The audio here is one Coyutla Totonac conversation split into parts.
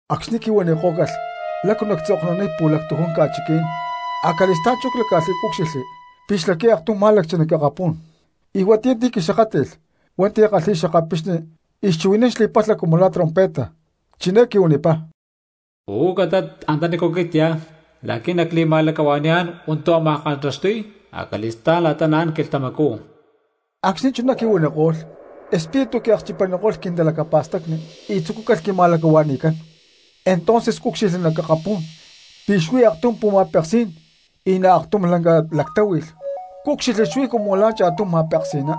Acxni̠ quihuanikó̠calh lácu nacca̠tzoknuniy pu̠lactujún ca̠chiquí̠n, acali̠stá̠n chú cláca̠lh y cúcxilhli pi̠ xlaqui̠y aktum má̠lacchi nac akapú̠n, y huatiyá ti̠ quixakátli̠lh hua̠nti̠ kalhi̠y xakapixni y chuhui̠nán xli̠palha cumu la̠ trompeta, chiné quihuanipá: —Uú catat antanícu aquit cyá la̠qui̠ nacli̠ma̠lacahua̠ni̠yá̠n hua̠ntu̠ ámaj kantaxtuy acali̠stá̠n la̠ta naán quilhtamacú. Acxni̠ chuná quihuaniko̠lh, Espíritu quiakchipaniko̠lh quintalacapa̠stacni y tzucúcalh quima̠lacahua̠ni̠cán; entonces cúcxilhli nac akapú̠n pi̠ xuí aktum pu̠ma̠peksí̠n y nac aktum lanca lactáhui̠lh cúcxilhli xuí cumu la̠ cha̠tum ma̠peksi̠ná.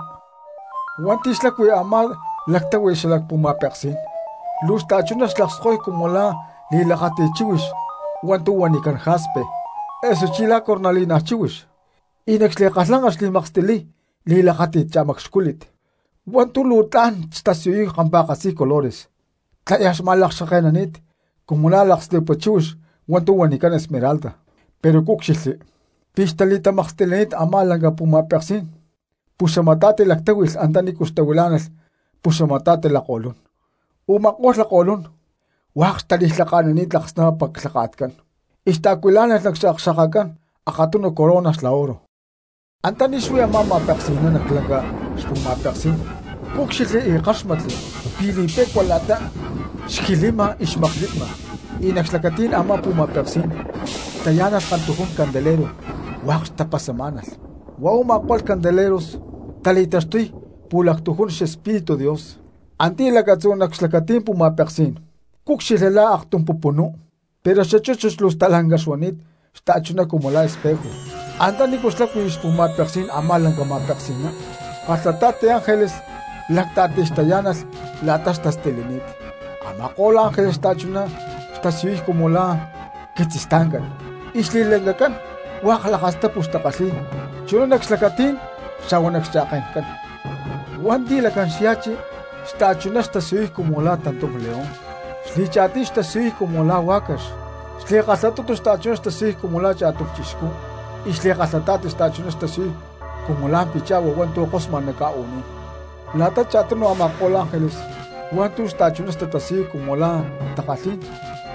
Hua̠nti̠ xlacui a̠má lactáhui̠lh xalac pu̠ma̠peksí̠n, luu xta̠chuná xlakskoy cumu la̠ li̠lakáti̠t chíhuix hua̠ntu̠ huanicán jaspe, osuchí la̠ cornalina chíhuix, y nac xli̠kalhlanca xli̠makstiliy li̠lakáti̠t cha̠macxcúlit hua̠ntu̠ luu tla̠n xtasiyuy kampa̠katzi colores tlayaj xma̠lakxkake̠nani̠t cumu la̠ lakslipua chíhuix hua̠ntu̠ huanicán esmeralda. Pero cúcxilhli pi̠ xtali̠tamakstilini̠t a̠má lanca pu̠ma̠peksí̠n puxamata̠ti lactáhui̠lh antanícu xtahuilá̠nalh puxamata̠ti lakko̠lún, u̠ma̠ko̠lh lakko̠lún hua̠k xtali̠lhaka̠nani̠t laksnapapa clhaka̠tcán y xtaacuilá̠nalh nac xakxa̠kacán akatunu corona xla oro. Antaní xuí a̠má ma̠peksi̠ná nac lanca xpu̠ma̠peksí̠n cúcxilhli y ckáxmatli pi̠ li̠pe̠cua la̠ta xjilima y xmaklipma; y nac xlacatí̠n a̠má pu̠ma̠peksí̠n xtayá̠nalh kantujún candelero hua̠k xtapasamá̠nalh, huá u̠ma̠ko̠lh candeleros tali̠taxtuy pu̠lactujún xEspíritu Dios. Antiyá lacatzú nac xlacatí̠n pu̠ma̠peksí̠n cúcxilhli la̠ aktum pupunú pero xachúchut luu stalanca xuani̠t xta̠chuná cumu la̠ espejo. Antanícu xlacui xpu̠ma̠peksí̠n a̠má lanca ma̠peksi̠ná kalhata̠ti ángeles lacta̠tij xtayá̠nalh la̠ta xtastilini̠t, a̠ma̠ko̠lh ángeles xta̠chuná xtatasiyuy cumu la̠ quitzistancán, y xli̠lancacán hua̠k lakastapu xtakalhi̠y chuná nac xlacatí̠n xa̠hua nac xcha̠ke̠ncán. Hua̠nti̠ lacán xya̠chi xta̠chuná xtasiyuy cumu la̠ tantum león, xli̠cha̠tiy xtasiyuy cumu la̠ huá̠cax, xli̠kalhatutu xta̠chuná xtasiyuy cumu la̠ cha̠tum cristiano, y xli̠kalhata̠ti xta̠chuná xtasiyuy cumu la̠ picha̠hua hua̠ntu̠ kosma nac ca̠u̠ní̠n. La̠ta cha̠tunu a̠ma̠ko̠lh ángeles hua̠ntu̠ xta̠chuná tatasiyuy cumu la̠ takalhí̠n,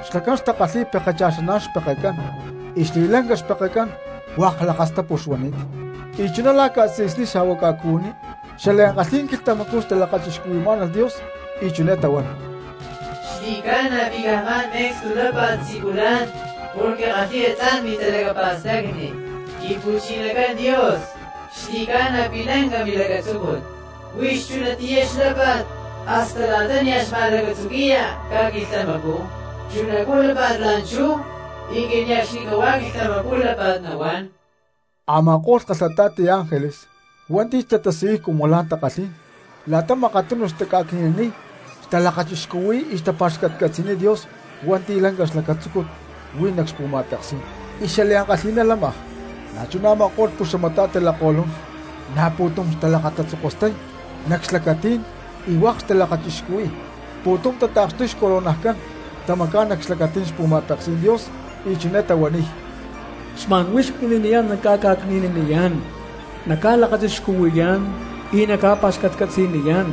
xlacán xtakalhi̠y pekecha̠xán xpekecán, y xli̠lanca xpekecán hua̠k lakastapu xuani̠t. Y chuná la̠ ca̠tzi̠sní xa̠hua ca̠cuhuiní xliankalhí̠n quilhtamacú talakachixcuhui̠má̠nalh Dios y chiné tahuán: ¡Xli̠ca̠na pi̠ caj xma̠n me̠cstu lápa̠t siculán porque kalhi̠ya tla̠n mintalacapa̠stacni; Quimpu̠chinacán Dios xli̠ca̠na pi̠ lanca milacatzúcut; huix chunatiyá xlápa̠t hasta la̠ta nia̠ xma̠lacatzuqui̠ya ca̠quilhtamacú, chunacú lápa̠t la̠nchú y cane̠cxnicahuá quilhtamacú lápa̠t nahuán! Ama̠ko̠lh kalhata̠ti ángeles hua̠nti̠ xtatasiyuy cumu la̠ takalhín, la̠ta makatunu taca̠cni̠naniy, talakachixcuhui̠y y tapa̠xcatcatzi̠niy Dios hua̠nti̠ lanca xlacatzúcut huí nac xpu̠ma̠peksí̠n y xliankalhi̠ná lámaj, na̠chuná a̠ma̠ko̠lh puxamata̠ti lakko̠lún na̠ pu̠tum talakatatzokostay nac xlacatí̠n y hua̠k talakachixcuhui̠y, pu̠tum tata̠kxtuy xcoronajcán, tamacá̠n nac xlacatí̠n xpu̠ma̠peksí̠n Dios y chiné tahuaniy: Xma̠n huix mini̠niyá̠n nacca̠ca̠cni̠naniyá̠n, nacca̠lakachixcuhui̠yá̠n y nacca̠pa̠xcatcatzi̠niyá̠n,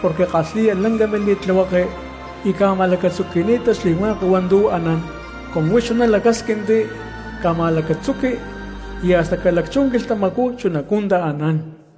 porque kalhi̠ya lanca mili̠tlihueke y ca̠ma̠lacatzuqui̠ni̠ta xli̠hua̠k hua̠ntu̠ anán; cumu huix chuná lacásquinti ca̠ma̠lacatzuqui y hasta ca̠lacchú quilhtamacú chunacú taanán.